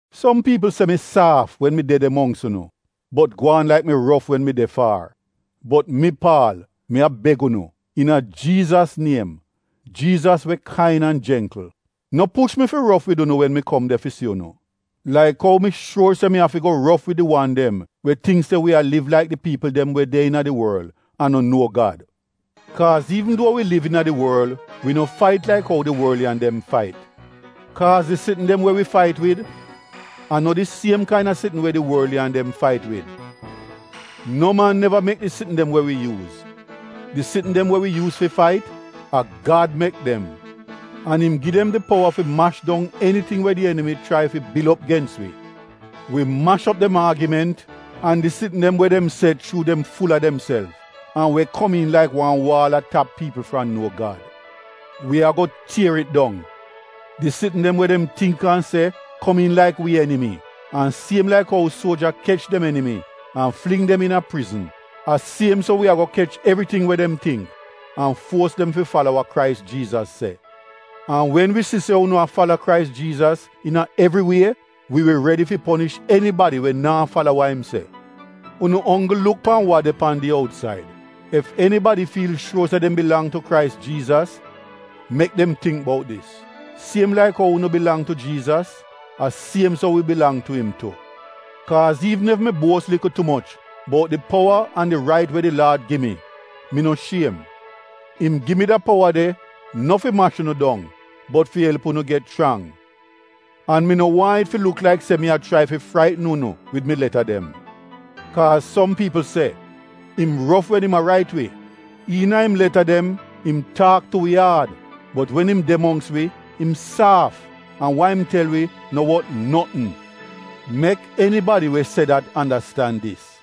Som piipl se mi saaf wen mi de de mongks unu bot gwaan laik mi rof wen mi de faar. Bot mi, Paal, mi a beg unu, iina Jiizas niem, Jiizas we kain an jengkl, no push mi fi rof wid unu wen mi kom de fi si unu, laik ou mi shuor se mi afi go rof wid di wan dem we tingk se wi a liv laik di piipl dem we de iina di worl an no nuo Gad. Kaaz iivn duo wi liv iina di worl wi no fait laik ou di worliyan dem fait. Kaaz di sitn dem we wi fait wid, a no di siem kaina sitn we di worliyan dem fait wid. No man neva mek di sitn dem we wi yuuz; di sitn dem we wi yuuz fi fait, a Gad mek dem an im gi dem di powa fi mash dong eniting we di enimi chrai fi bil op gens wi. Wi mash op dem aagiment, an di sitn dem we dem se chuu dem ful a demself, an we komiin laik wan waal a tap piipl fram nuo Gad. Wi ago tier it dong. Di sitn dem we dem tingk an se komiin laik wi enimi an siem laik ou suoja kech dem enimi an fling dem iina prizn, a siem so we ago kech evriting we dem tingk an fuos dem fi fala wa Krais Jiizas se. An wen wi si se unu a fala Krais Jiizas iina evri wie, wi wi redi fi ponish enibadi we naa fala wa im se. Unu onggl luk pan wa de pan di outsaid. Ef enibadi fiil shuor se dem bilang tu Krais Jiizas, mek dem tingk bout dis, siem laik ou unu bilang tu Jiizas, a siem so wi bilang tu im tu. Kaaz iivn ef mi buos likl tu moch bout di powa an di rait we di Laad gi mi, mi no shiem. Im gi mi da powa de no fi mash unu dong bot fi elp unu get chrang. An mi no waahn it luk laik se mi a chrai fi fraitn unu wid mi leta dem. Kaaz som piipl se, “Im rof wen im a rait wi. Iina im leta dem im taak tu wi aad bot wen im de mongks wi im saaf an wa im tel wi no wot notn.” Mek enibadi we se dat andastan dis,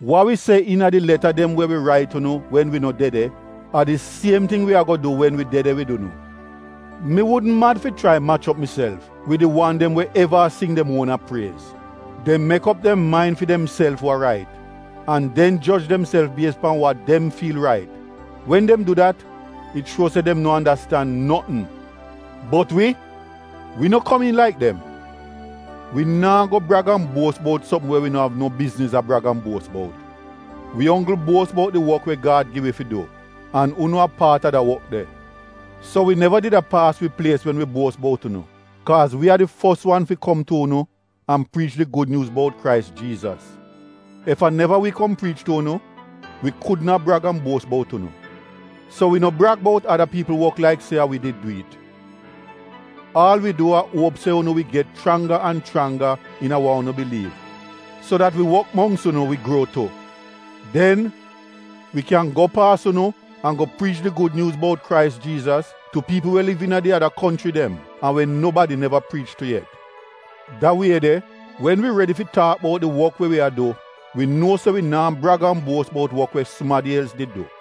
wa wi se iina di leta dem we wi rait unu wen wi no de de, a di siem ting wi ago du wen wi de de wid unu. Mi wudn mad fi chrai mach op miself wid di wan dem we eva a sing dem uona priez. Dem disaid fi demself wa rait an den joj demself bies pan wa dem fiil rait. Wen dem du dat it shuo se dem no andastand notn. Bot wi, wi no komiin laik dem. Wi naa go brag an buos bout sopm we wi no av no bizniz a brag an buos bout. Wi onggl buos bout di wok we Gad gi wi fi du, an unu a paat a de wok de. So wi neva did a paas wi plies wen wi buos bout unu kaaz wi a di fos wan fi kom tu unu an priich di Gud Nyuuz bout Krais Jiizas. Ef a neva wi kom priich tu unu, wi kudn a brag an buos bout unu. So wi no brag bout ada piipl wok laik se a wi did du it. Aal wi du a uop se unu wi get chrangga an chrangga iina wa unu biliiv, so dat wi wok mongks unu wi gruo tu. Den, wi kyan go paas unu an go priich di Gud Nyuuz bout Krais Jiizas tu piipl we liv iina di ada konchri dem an we nobadi neva priich tu yet. Da wie de wen wi redi fi taak bout di wok we wi a du, wi nuo se wi naa brag an buos bout wok we sumadi els did du.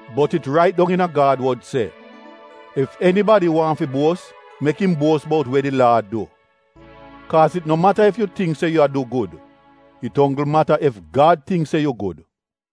Bot it rait dong iina Gad wod se, “Ef enibadi waahn fi buos mek im buos bout we di Laad du.” Kaaz it no mata ef yu tingk se yu a du gud, it onggl mata ef Gad tingk se yu gud.